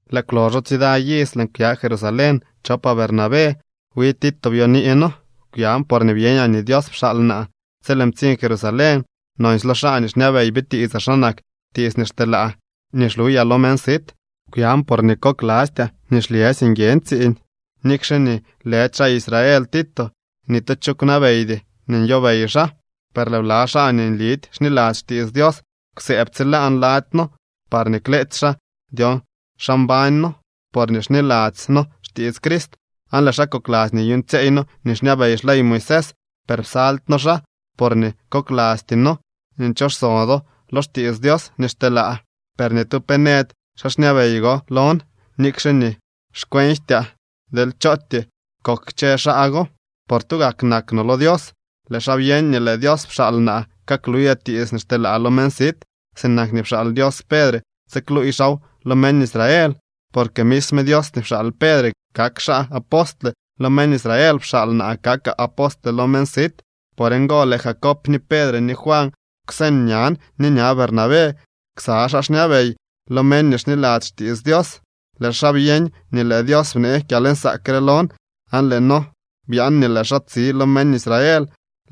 Lëë kwloxo tsida iz lëën kwya Jerusalén chopaa Bernabé. Wi Tito byonii noo. Kwyan porñee byeñaa nii Dios pxaal naa. Tsi lëën ptsiñ Jerusalén, nonsy lo xaa nii xñabey bitiitsaa xa nak tiits nii xteelaa nii xluyaa lo meñ sit. Kwyan porñee koklastyaa nii xlyësy nguiën tsiiñ. Nikxe nii lëdy xaa Israel Tito, ni tu cho kwnabeydy nii nyobey xaa. Per lëë bla xaa nii nlidy xniladzy xtiits Dios kwsëëb tsilaan lady noo parñee kleetsy xaa dyon xa mbañ noo porñee xniladzy noo xtiits Crist aan lëë xaa kokladzy nii nyuuñtsyeey noo nii xñabey xley Moisés. Per psaldy noo xaa, porñee koklasty noo nii nchoxso do lo xtiits Dios nii xteelaa. Per ni tu pe nëdy xaa xñabey go lon, nikxe nii xkwenjtyaa deel chootyee kok kchë xaa go, por tugak nak no lo Dios. Lëë xaa byeñ nii lëë Dios pxaal naa kakluyaa tiits nii xteelaa lo meñ sit, sinak nii pxaal Dios Pedre tsikluuy xaaw lo meñ Israel. Porque misme Dios nii pxaal Pedre kak xaa apostle lo meñ Israel, pxaal naa kakaa apostle lo meñ sit. Por ngo lëë Jacob ni Pedre ni Juan kwseñ ñan ni ña Bernabé ksa xaa xñabey lo meñ nii xniladzy xtiits Dios. Lëë xaa byeñ nii lëë Dios bnee kyalnsaak re lon aan lëë noo byaan nii lëë xaa tsi lo meñ Israel,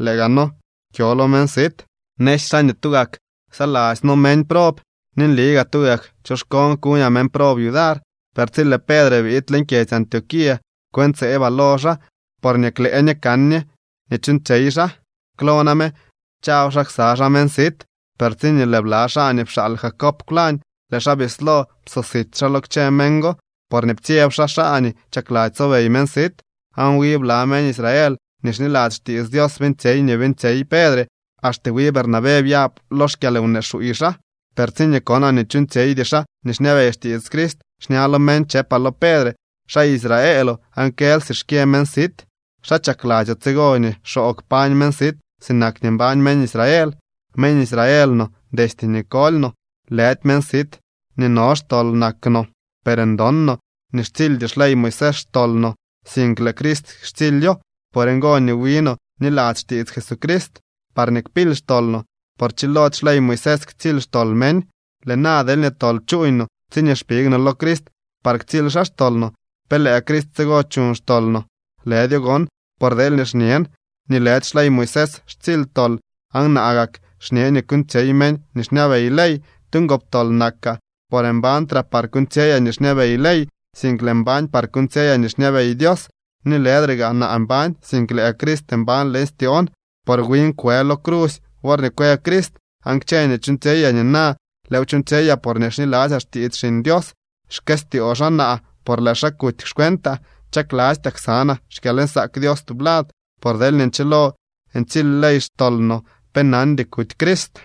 lëë gaa noo kyo lo meñ sit. Nësy xaa nii tugak ksaladzy noo meñ prob, ni nli gaa tugak choxkoon kuñaa meñ prob yudar. Per tsi lëë Pedre biid leñ kyedzy Antioquía, kwëntseebaa lo xaa, porñee klëë ñe kan ñe nii chuuñtsyey xaa. Klo name chaw xaa ksa xaa meñ sit, per tsiñee lëë bla xaa nii pxaal Jacob kwlañ, lëë xaa bislo psosit xaa lo kchë meñ go, porñee ptsyeb xaa xaa nii chakladzy tsobey meñ sit. Aan wi bla meñ Israel nii xniladzy xtiits Dios beeñtsyey nii beeñtsyey Pedre, axte wi Bernabé byab lo xkyalwnee xuuy xaa. Per tsiñee konaa nii chuuñtsyeydy xaa nii xñabey xtiits Crist, xña lo meñ chëpaa lo Pedre: “Xaa Israeloo aan kël si xkyë meñ sit. ¿Xa chakladzyoo tsigo nii xoo kpañ meñ sit sinak nii mbañ meñ Israel?” Meñ Israel no destye nii koly no, lëdy meñ sit nii no xtol nak no. Per ndon no nii xtsildy xley Moisés xtol no, sink lëë Crist xtsilyo. Por ngo nii wi no bniladzy xtiits Jesucrist, parñee kpily xtol no, por chilody xley Moisés ktsily xtol meñ. Lëë na deelñee tol chuuñ no tsiñee xpig no lo Crist par ktsily xaa xtol no, ¿pe lëë Crist tsigo chuñ xtol no? ¡Lëdyo gon! Por deelñee xñen nii lëdy xley Moisés xtsily tol aan naa gak xñee nii kuuñtsyey meñ nii xñabey ley, tu ngoptol nakaa. Por mbañtraa par kuuñtsyeyaa nii xñabey ley, sink lëën mbañ par kuuñtsyeyaa nii xñabey Dios. Ni lëdre gaa naa mbañ, sink lëë Crist mbañ leñ styoon, por win kwë lo crusy worñee kwë Crist. Aan kchë nii chuuñtsyeyaa nina lëëw chuuñtsyeyaa porñee xniladzyaa xtiits Xiñ Dios. Xkëstyoo xaa naa por lëë xaa kuty xcuentaa. Chaklastyaa ksanaa xkyalnsaak Dios tublad, por deelñee nchilo ntsily ley xtol no, pe nandy kuty Crist.